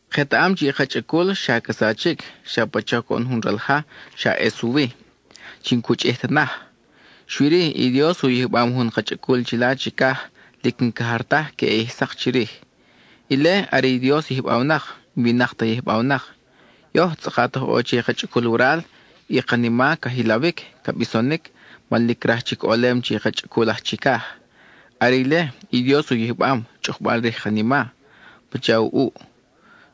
Ketaʼam chi i ka chʼacul xa ca sachic, xa pacha coʼon jun ral ja, xa ʼes u wi, chi n-cu chʼij ta naj. Xui-ri, i Dios u yijbam jun ka chʼacul chila chicaj, lic n-ca jar taj queʼe ʼij sak chirij. Ile, are i Dios yijbawnak; n-winak ta yijbawnak. Yoj, tzʼakat oj ʼo che i ka chʼacul waral, i kanima ca jilawic, ca bisonic man lic craj chic ʼolem che i ka chʼacul aj chicaj. Are ile, i Dios u yijbam, chʼukbal rij i kanima, pacha u ʼuʼ.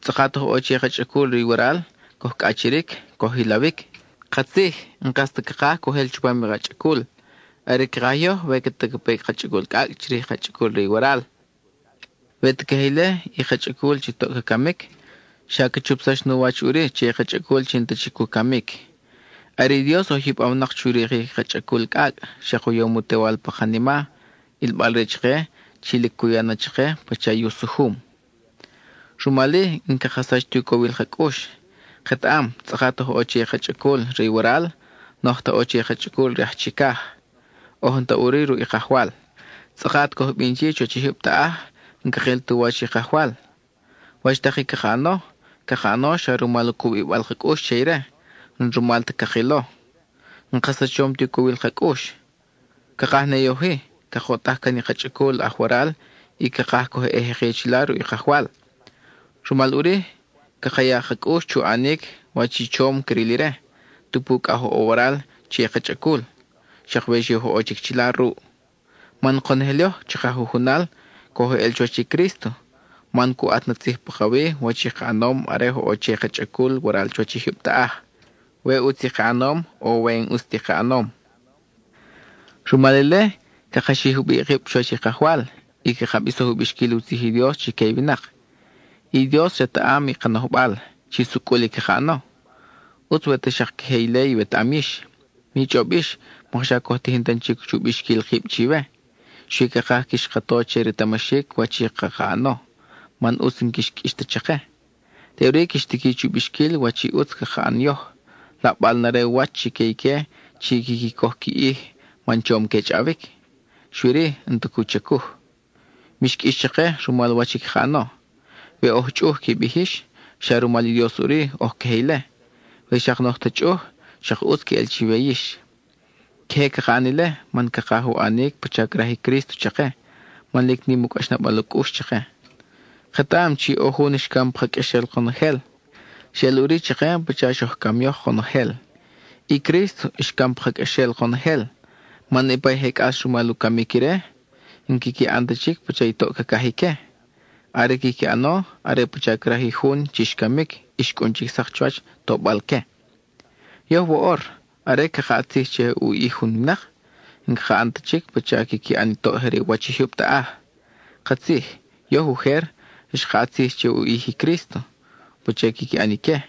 Tzʼakat oj ʼo che i ka chʼacul re i waral, coj cʼachiric, coj jilawic. Katzij, n-kas ta cakaj coj ʼel chupam i ka chʼacul; are i cakaj yoj we ta ca pe i ka chʼacul cʼacʼ chirij i ka chʼacul re i waral. We ta queje ile, i ka chʼacul chi toʼ ca camic, xa ca chupsax nu wach ʼuri che i ka chʼacul chi n-ta chic u camic. Are i Dios oj yijbawnak chu rikic i ka chʼacul cʼacʼ, xak u yom u Tewal pa kanima, ʼilbal-re chake chi lic cu ya na chake pacha i u sujum. Rumal-i, n-caka sach ti u cowil ka cʼux. Ketaʼam, tzʼakat oj ʼo che i ka chʼacul re i waral, n-oj ta ʼo che i ka chʼacul re aj chicaj, oj n-ta ʼuri ruʼ i Kajwal. (Tzʼakat coj bin chi chuwach i jyub taʼaj, n-cakil tu wach i Kajwal.) Wach tak i caka ʼano, caka ʼano xa rumal u cubibal ka cʼux che ire, n-rumal ta cakilo. N-ka sachom ti u cowil ka cʼux. Cakaj ne yoj-i, cakoʼtaj can i ka chʼacul aj waral y cakaj coj ʼe jeki chila ruʼ i Kajwal. Rumal ʼuri caka ya ka cʼux chu ʼanic wach i chom cril ire, tupu cʼa oj ʼo waral che i ka chʼacul, xak we xi oj ʼo chic chila ruʼ. Man konojel yoj chaka jujunal, coj eʼel chuwach i Crísto, man cu ʼat na tzij pakawi wach i ka ʼanom are oj ʼo che i ka chʼacul waral chuwach i jyub taʼaj, we ʼutz i ka ʼanom, o we n-ʼus ti ka ʼanom. Rumal ile, caka xij jubiʼ kib chuwach i Kajwal, y caka bisoj u bixquil u tzij i Dios chique i winak. I Dios retaʼam i ka nojbal, chi sucʼul i caka ʼano; ʼutz we ta xak queje ile iwetaʼam yix. Mi chʼob yix mokxa coj tijin tan chic chu bixquil kib chiwe. Xui cakaj quix ka to chi retamaxic wach i caka ʼano, man ʼutz n-quix qʼuix ta chake. Teʼuri quix tiqui chu bixquil wach i ʼutz caka ʼan yoj, laʼbal na re u wach chique ique chi quiqui coj qui ʼij man chom que chʼawic, xui-ri, n-ta cu chacuj. Mix qʼuix chake rumal wach i caka ʼano. We oj chʼuj qui bij yix, xa rumal i Dios ʼuri oj queje ile. We xak n-oj ta chʼuj, xak ʼutz queʼel chiwe yix. Queje caka ʼan ile, man cakaj u ʼanic pacha craj i Crísto chake, man lic nim i cʼaxnabal u cʼux chake. Ketaʼam chi ʼo jun xcam pa ka qʼuexel konojel; xeʼel ʼuri chake pacha xoj cam yoj konojel. I Crísto xcam pa ka qʼuexel konojel, man niʼpa i je cʼas rumal u camic ire, n-quiqui ʼan ta chic pacha i toʼ cacaj ique. Are i quiqui ʼano, are pacha craj i jun chi xcamic y xcʼun chic sak chuwach tobal-que. Yoj woʼor, are caka ʼat tzij che u ʼij jun winak, n-caka ʼan ta chic pacha quiqui ʼan i toʼ je re u wach i jyub taʼaj. Katzij, yoj ujer, xka ʼat tzij che u ʼij i Crísto pacha quiqui ʼan ique,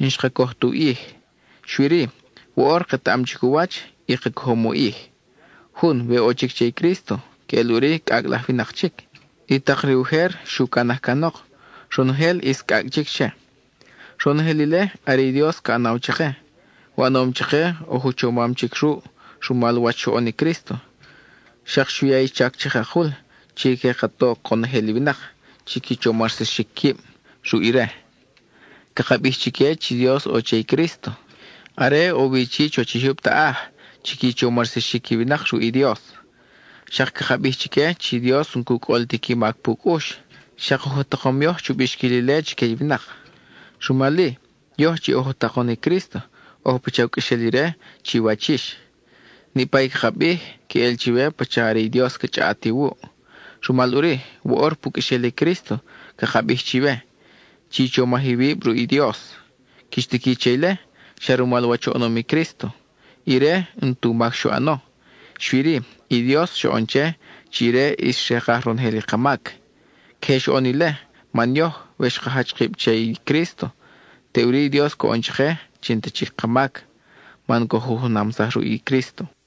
n-xka coj tu ʼij. Xui-ri, woʼor ketaʼam chic u wach, y ka cojom u ʼij. Jun, we ʼo chic che i Crísto, queʼel ʼuri cʼacʼ laj winak chic. I tak re ujer xu canaj canok; ronojel ʼis cʼacʼ chic che. Ronojel ile, are i Dios ca ʼanaw chake. U ʼanom chake, oj u chomam chic ruʼ, rumal wach xoʼon i Crísto. Xak xu ya i chac chakakul chi que ka to conojel i winak chi qui chomarsaxic quib ruʼ ire. Caka bij chique chi Dios ʼo che i Crísto, are ʼo wi chi chuwach i jyub taʼaj, chi qui chomarsaxic i winak ruʼ i Dios. Xak caka bij chique chi Dios n-cu cʼol ti qui mac pu cʼux; xak oj u takom yoj chu bixquil ile chique i winak. Rumal-i, yoj chi oj u takon i Crísto, oj pacha u qʼuexel ire chiwach yix. Niʼpa i caka bij, queʼel chiwe pacha are i Dios ca chʼaʼat iwuʼ. Rumal ʼuri, woʼor pu qʼuexel i Crísto, caka bij chiwe: chi chomaj iwib ruʼ i Dios. Quix tiqui che ile, xa rumal wach oʼonom i Crísto; ire, n-tu mac xu ʼano; xui-ri, i Dios xoʼon che, chi ire ʼis xrekaj ronojel i ka mac. Queje xoʼon ile, man yoj, we xka jach kib che i Crísto, teʼuri i Dios coʼon chake chi n-ta chic ka mac, man coj u junamsaj ruʼ i Crísto.